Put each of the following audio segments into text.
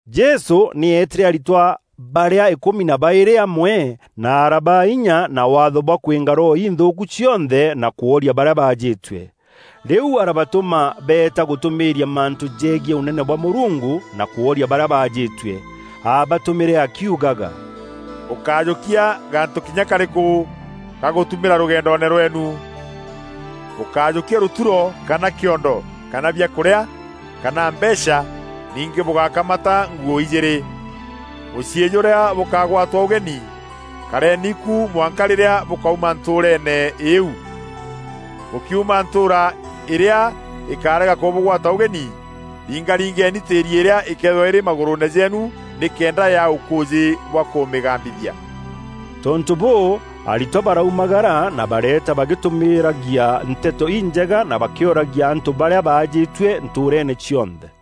Jesû nî eetîre aritwa barîa îkûmi na baîrî amwe, na arabaa inya na waatho bwa kwînga roho inthûûku cionthe na kworia barîa baajîtue. Rîu arabatûma beeta gûtûmîîria mantû jegiî Ûnene bwa Mûrungu, na kwooria barîa baajîtue. Aabatûmîre akiugaga, “Bûkájûkia gantû kinya karîkû gagûtumîra rûgendoone rweenu: Bûkájûkia rûturo, kana kîondo, kana biakûrîa, kana mbeecha. Ningî bûgákamata nguû ijîîrî. Mûciî jûrîa bûkagwatwa ûgeni, kareeni ku mwanka rîrîa bûkauma ntûûreene îîu. Bûkiuma ntûûra îrîa îkarega kûbûgwata ûgeni, ringaringeni tîîri îrîa îkeethîrwa îrî magûrûûne jeenu nîkenda yaa ûkûûjî bwa kûmîgambithia.” Tontû bûû, aritwa baraumagara na bareeta bagîtumîîragia Nteto Injega na bakîoragia antû barîa baajîtue ntûûreene cionthe.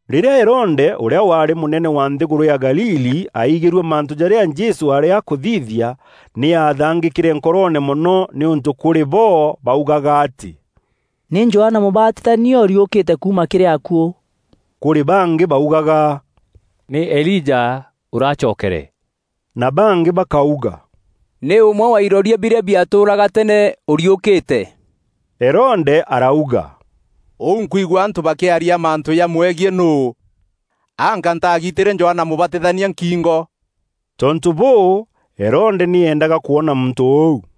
Rîrîa Herode ûrîa waarî mûnene wa nthîgûrû ya Galili, aigîrue mantû jarîa Jesû aarî akûthithia, nî aathangîkîre nkoroone mono nîûntû kûrî bo baugaga atî, “Nî Johana Mûbatithania ûriûkîte kuuma kîrî akuû.” Kûrî bangî baugaga, “Nî Elija ûracokere na bangî bakauga, ‘Nî ûmwe wa iroria birîa biatûûraga teene ûriûkîte.’” Herode arauga, “Ûu nkwigua antû bakîaria mantû jamwegiî nûû? Anga ntagitîre Johana Mûbatithania nkîngo?” Tontû bûû, Herode nî eendaga kwona muntû ûu.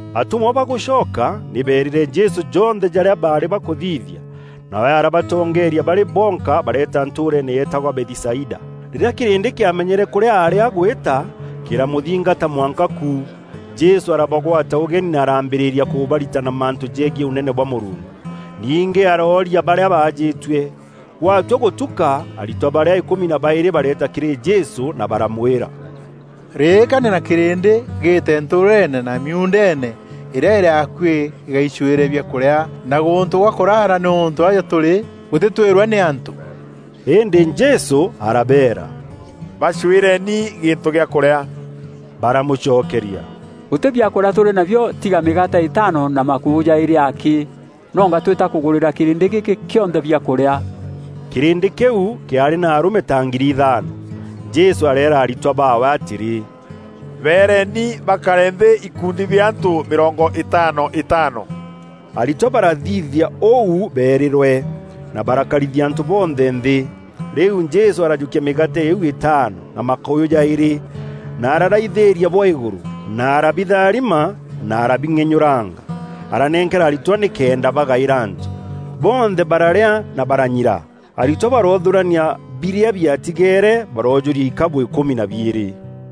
Atûmwa bagûcoka, nî beerîre Jesû jonthe jarîa baarî bakûthithia. Nawe arabatongeeria barî bonka bareeta ntûûreene yeetagwa Bethisaida. Rîrîa kîrîndî kîamenyere kûrîa aarî agwîta, kîramûthingata mwanka ku. Jesû arabagwata ûgeni na arambîrîria kûbaritana mantû jegiî Ûnene bwa Mûrungu. Ningî arooria barîa baajîtue. Gwatua gûtûka aritwa barîa îkûmi na baîrî bareeta kîrî Jesû na baramwîra, “Rîîkania na kîrîndî gîîte ntûûreene na miuundeene îrîa îrî akuî gîgaicûîre biakûrîa na gûntû gwa kûrara nîûntû aja tûrî gûtîtwîrwe nî antû.” Îndî Jesû arabeera, “Bacwîreni gîntû gîa kûrîa.” Baramûcokeria, “Gûtî biakûrîa tûrî nabio tiga mîgaate îtaano na makûyû jaîrî akî; nonga twîîta kûgûrîra kîrîndî gîkî kîonthe biakûrîa.” Kîrîndî kîu kîaarî na arûme ta ngiri ithaano. Jesû areera aritwa baawe atîrî, “Beereni bakare nthî ikundi bia antû mîrongo îtaano îtaano.” Aritwa barathithia ûu beerîrwe, na barakarithia antû bonthe nthî. Rîu Jesû arajûkia mîgaate îîu îtaano, na makûyû jaîrî, na araraithîîria bwa îgûrû, na arabitharima na arabing'enyûranga. Aranenkera aritwa nîkenda bagaîra antû. Bonthe bararîa na baranyira; aritwa baroothûrania birîa biatigeere baroojûria ikabû îkûmi na biîrî.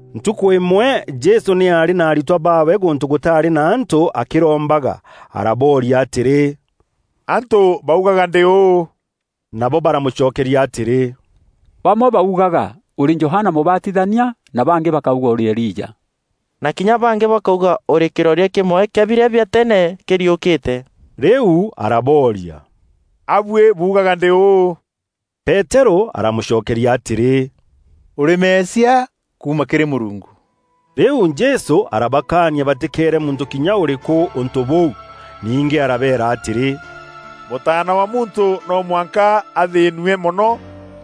Ntukû îmwe Jesû nî aarî na aritwa baawe gûntû gûtaarî na antû akîrombaga. Arabooria atîrî, “Antû baugaga ndî ûû?” Nabo baramûcokeria atîrî, “Bamwe baugaga ûrî Johana Mûbatithania na bangî bakauga ûrî Elija na kinya bangî bakauga ûrî kîroria kîmwe kîa birîa bia teene kîriûkîte.” Rîu arabooria, “A buî buugaga ndî ûû?” Peterû aramûcokeria atîrî, “Ûrî Mesia, kuuma kîrî Mûrungu.” Rîu Jesû arabakaania batîkeere muntû kinya ûrîkû ûntû bûu. Ningî arabeera atîrî, “Mûtaana wa Muntû no mwanka athîînue mono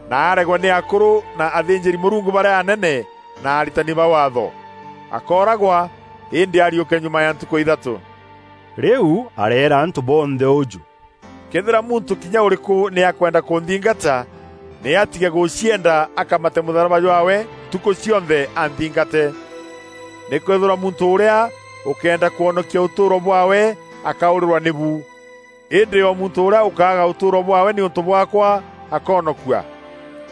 na aregwe nî akûrû na athînjîri-Mûrungu barîa anene na aritani ba Waatho. Akooragwa îndî ariûke nyuma ya ntukû ya ithatû.” Rîu areera antû bonthe ûjû, “Këethîra muntû kinya ûrîkû nî akwenda kûnthingata, nî atige gûcienda akamate mûtharaba jwaawe ntukû cionthe anthingate. Nîkwîthîrwa muntû ûrîa ûkeenda kwonokia ûtûûro bwaawe akaûrîrwa nîbu. Îndî o muntû ûrîa ûkaaga ûtûûro bwaawe nîûntû bwaakwa, akoonokua.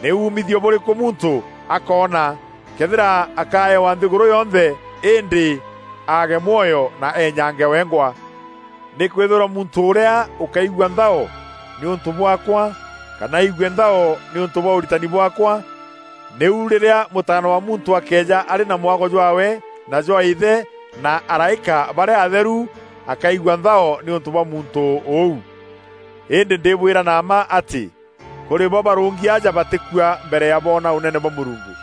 Nî umithio bûrîkû muntû akoona, këethîra akaewa nthîgûrû yonthe îndî aage mwoyo na eenyange wengwa? Nîkwîthîrwa muntû ûrîa ûkaigua nthao nîûntû bwaakwa kana aigue nthao nîûntû bwa ûritani bwaakwa, nîu rîrîa Mûtaana wa Muntû akeeja arî na mwago jwaawe na jwa Îthe na araîka barîa atheru, akaigua nthao nîûntû bwa muntû ûu. Îndî ndîbwîra na mma atî kûrî bo barûngi aja batîkua mbere ya boona Ûnene bwa Mûrungu.”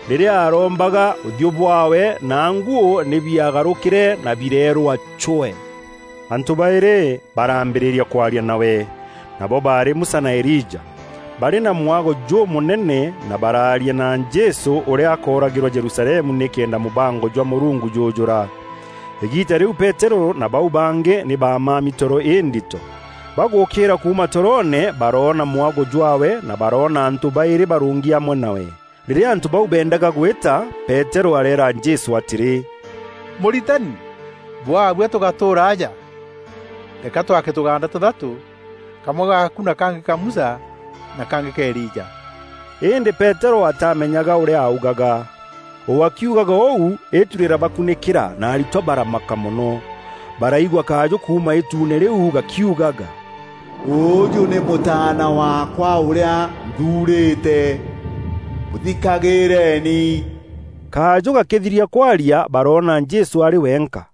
Rîrîa aarombaga, ûthiû bwaawe na nguû nî biagarûkîre na bireerûa cwee. Antû baîrî baraambîrîa kwaria nawe: nabo baarî Musa na Elija. Baarî na mwago jûmûnene na baraaria na Jesû ûrîa akooragîrwa Jerusalemu nîkenda mûbango jwa Mûrungu jûûjûra. Îgiita rîu Peterû na bau bangî nî bamami toro îndito. Bagûûkîîra kuuma toroone baroona mwago jwaawe na baroona antû baîrî barûngi amwe nawe. Rîrîa antû bau beendaga gwîta, Peterû areera Jesû atîrî, “Mûritani, bwabua tûgatûûra aja. Reka twake tûgaanda tûthatû: kamwe gaaku na kangî ka Musa na kangî ka Elija.” Îndî Peterû atamenyaga ûrîa augaga. O akiugaga ûu, îtu rîrabakûnîkîra na aritwa baramaka mono. Baraigua kajû kuuma îtuune rîu gakiugaga, “Ûûjû nî Mûtaana waakwa ûrîa nthuurîte; mûthikagîîreni!” Kajû gakîthiria kwaria baroona Jesû arî wenka.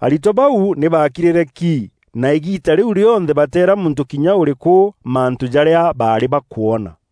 Aritwa bau nî baakirîre ki, na îgiita rîu rîonthe bateera muntû kinya ûrîkû, mantû jarîa baarî bakwona.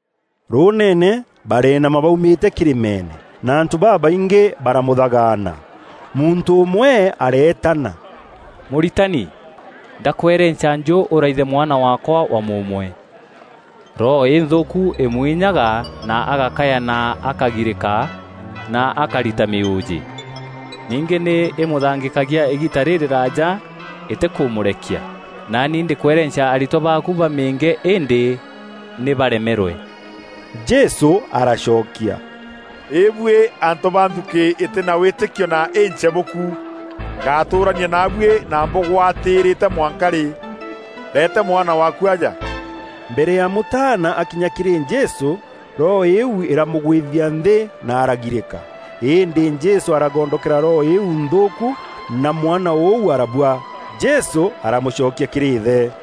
Rûûneene barenama baumîte kîrîmeene, na antû babaingî baramûthagaana. Muntû ûmwe areetana, “Mûritani, ndakwerenca njû ûraithe mwana waakwa wa mûûmwe! Roho înthûûku îmûinyaga na agakaya na akagirîka na akarita mîûjî. Ningî nî îmûthangîkagia îgiita rîrîraaja îtîkûmûrekia. Naani ndîkwerenca aritwa baaku bamîînge îndî nî baremerwe.” Jesû aracokia, “Îbuî antû ba nthukî îtî na wîtîkio na închebûku! Ngatûûrania naabuî na mbûgwatîrîte mwanka rî? Reete mwana waaku aja.” Mbere ya mûtaana aakinya kîrî Jesû, roho îîu îramûgwîthia nthî na aragirîka. Îndî Jesû aragondokera roho îîu nthûûku na mwana ûu arabua. Jesû aramûcokia kîrî îthe.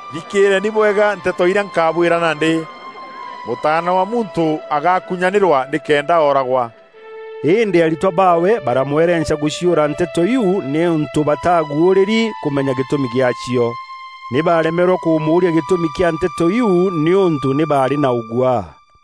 “Thikîîreeni bwega nteto irîa nkabwîra nandî: Mûtaana wa Muntû agakunyaanîrwa nîkenda ooragwa.” Îndî aritwa baawe bararemwa gûciûra nteto iu nîûntû bataguûrîri kûmenya gîtûmi gîacio. Nî baaremerwe kûmûûria gîtûmi kîa nteto iu nîûntû nî baarî na ûguaa.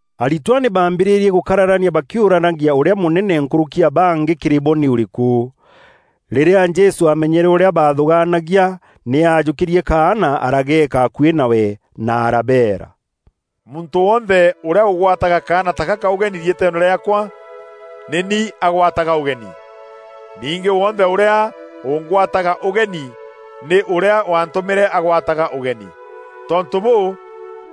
Aritwa nî baambîrîrie gûkararania bakîuranagia ûrîa mûnene nkûrûki ya bangî kîrî bo nî ûrîkû. Rîrîa Jesû aamenyere ûrîa baathûgaanagia, nî aajûkîrie kaana arageeka akuî nawe na arabeera, “Muntû wonthe ûrîa ûgwataga kaana ta gaka ûgeni riîtweene rîaakwa, nî ni agwataga ûgeni. Ningî wonthe ûrîa ûngwataga ûgeni nî Ûrîa waantûmîre agwataga ûgeni. Tontû bûû,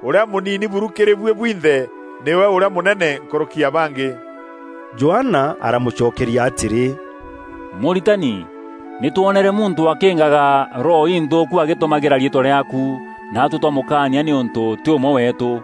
ûrîa mûnini buru kîrî buî bwinthe, nîwe ûrîa mûnene nkûrûki ya bangî.” Johana aramûcokeria atîrî, “Mûritani, nî twonere muntû akîîngaga roho inthûûku agîtumagîra riîtwa rîaaku, naatuî twamûkaania nîûntû tî ûmwe weetû.”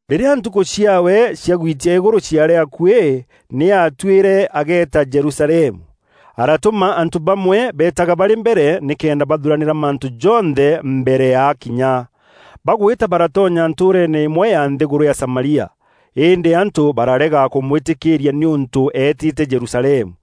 Rîrîa ntukû ciaawe cia gwitia îgûrû ciaarî akuî, nî aatuîre ageeta Jerusalemu. Aratûma antû bamwe beetaga barî mbere nîkenda bathuranîra mantû jonthe mbere ya akinya. Bagwîta baratonya ntûûreene îmwe ya nthîgûrû ya Samaria. Îndî antû bararega kûmwîtîkîîria nîûntû eetîte Jerusalemu.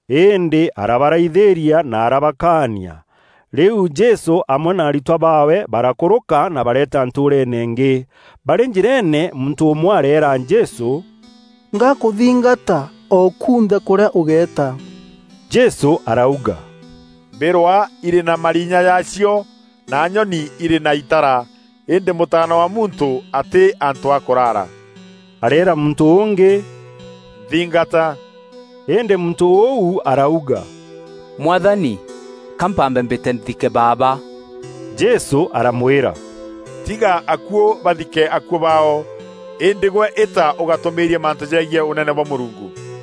Îndî arabaraithîria na arabakaania. Rîu Jesû amwe na aritwa baawe barakûrûka na bareeta ntûûreene îngî. Barî njîreene, muntû ûmwe areera Jesû, “Ngakûthingata o kunthe kûrîa ûgeeta.” Jesû arauga, “Mbîrwa irî na marinya jaacio na nyoni irî na itara; îndî Mûtaana wa Muntû atî antû a kûrara.” Areera muntû ûngî, “Nthingata.” Îndî muntû ûu arauga, “Mwathani, ka mpambe mbîte nthike baaba.” Jesû aramwîra, “Tiga akuû bathike akuû baao; îndî gwe îta ûgatûmîîrie mantû jegiî Ûnene bwa Mûrungu.”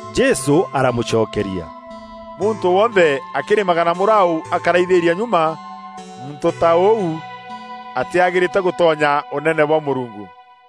Jesû aramûcokeria, “Muntû wonthe akîrîmaga na mûraû akaraithîria nyuma, muntû ta ûu atîagîrîte gûtonya Ûnene bwa Mûrungu.”